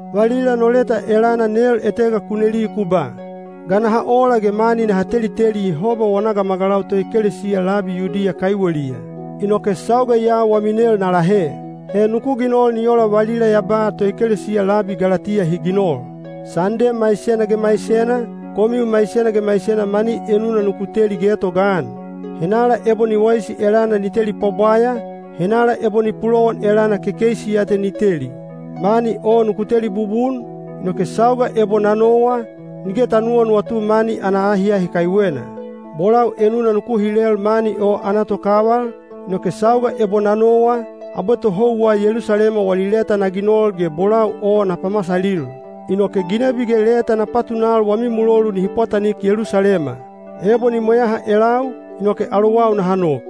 Valila no leta elana nel etega ku neli ku ba, “Ga naha ola ge mani naha teliteli Yehoba wana gamagalau toekelesiya labi Yudiya kaiweliya?” Inoke sauga ya wami nel na lahe. He nuku ginol ni ola valila ya ba toekelesiya labi Galatiya hi ginol. Sande maisena ge maisena, komiu maisena ge maisena mani enuna nuku teli getogaan. Henala ebo ni waisi elana ni teli pwabwaya, henala ebo ni pulowan elana kekeisi ya te ni teli. Mani o nuku teli bubun, inoke sauga ebo na nowa, nige ta nuwanuwatu mani ana ahiahi kaiwena. Bolau enuna nuku hilel mani o ana tokaval, inoke sauga ebo na nowa, abwe tohouwa Yelusalema wali leta na ginol ge bolau o na pamasalil. Inoke ginebi ge leta na patunal wami mulolu nihi pwatanik Yelusalema. Ebo ni mweyaha elau, inoke alowau naha nok.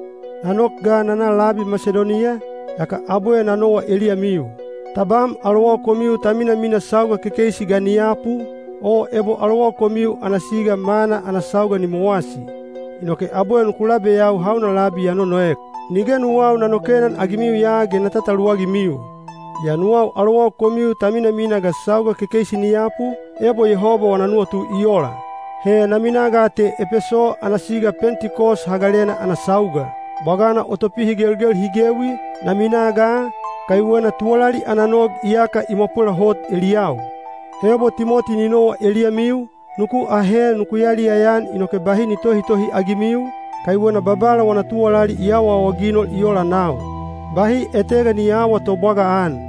Na nok ga na na labi Masidoniya, yaka abwe na nowa eliyamiu. Tabam alowau komiu ta minamina sauga kekeisi ga ni yapu, o ebo alowau komiu ana siga mana ana sauga ni mowasi. Inoke abwe nuku labeyau hauna labi ya nonoek. Nige nuwau na nokenan-agimiu ya ge na tataluwagimiu. Yaa nuwau alowau komiu ta minamina ga sauga kekeisi ni yapu, ebo Yehoba wana nuwatu i ola. He na minaa ga te Epeso ana siga Pentikos Hagalena ana sauga. Bwagana o topihigelgel hi gewi, na minaa ga, kaiwena tuwalali ana nog iyaka i mwapwela hot eliyau. Ebo Timoti ni nowa eliyamiu, nuku ahe nuku yaliyaya-an inoke bahi ni tohitohi-agimiu, kaiwena Babala wana tuwalali i awaawaginol i ola nau. Bahi etega ni aawa tobwagaan.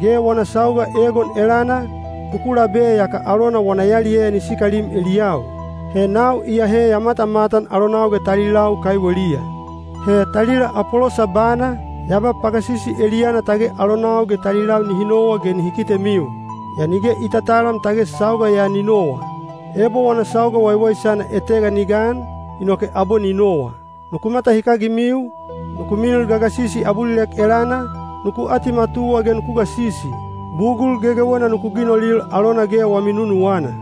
Ge wana sauga egon elana, nuku labe yaka alona wana yaliyaya ni sikalim eliyau. He nau iyahe ya matamatan alonau ge talilau kaiweliya. He talila Apolosa bana, ya ba pagasisi eliyana tage alonau ge talilau nihi nowa ge ni kitemiu. Yaa nige i tatalam tage sauga ya ni nowa. Ebo wana sauga waiwaisana etega ni gan, inoke abwe ni nowa. Nuku matahikagimiu, nuku milil gagasisi abulilek elana, nuku atimatuwa ge nuku gasisi. Bugul gegewena nuku ginolil alona ge wami nunuwana.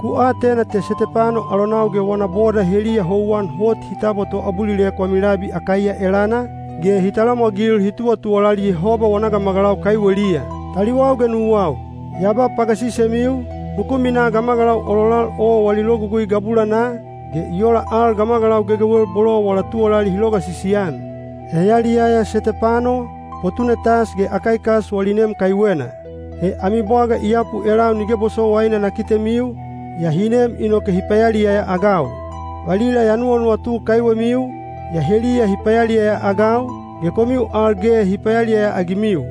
Ku atena te Setepano alonau ge wana boda heliya houwan hot hi tabwa toabulilek wami labi Akaiya elana, ge hi talamwagil hi tuwatuwalali Yehoba wana gamagalau kaiweliya. Taliwau ge nuwau, ya ba pagasisemiu, nuku minaa gamagalau ololal o wali logugui gabulanaa, ge i ola al gamagalau gegewel bolo wala tuwalali hi logasisi-an. Ya yaliyaya Setepano, Potunetas ge Akaikas wali nem kaiwena. He ami bwaga i yapu elau nige bosowaina na kitemiu, yaa hi nem inoke hi payaliyaya-agau. Valila ya nuwanuwatu kaiwemiu, yaa heliya hi payaliyaya-agau, ge komiu al ge hi payaliyaya-agimiu.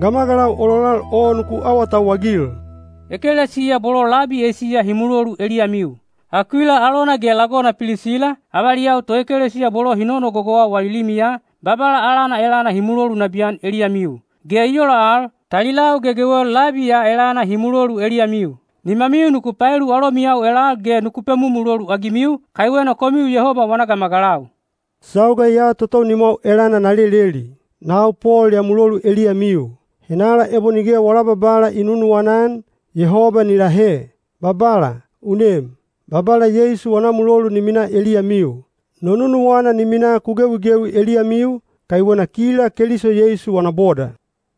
Gamagalau ololal o nuku awatauwagil. Ekelesiya bolo labi Eisiya hi mulolu eliyamiu. Akuila alona ge lagona Pilisila, avaliyau toekelesiya bolo hi nonogogowa wali limiya, Babala alana elana hi mulolu nabiyan eliyamiu. Ge i ola al, talilau gegewel labi ya elana hi mulolu eliyamiu. Nimamiu nuku paelu alomiyau elal ge nuku pemumulolu-agimiu, kaiwena komiu Yehoba wana gamagalau. Sauga ya totou nimwau elana na leleli. Nau Pol ya mulolu eliyamiu. Henala ebo nige wala Babala i nunuwana-an, Yehoba ni lahe! Babala, u nem! Babala Yeisu wana mulolu ni minaa eliyamiu. No nunuwana ni minaa ku gewigewi eliyamiu, kaiwena kila Keliso Yeisu wana boda.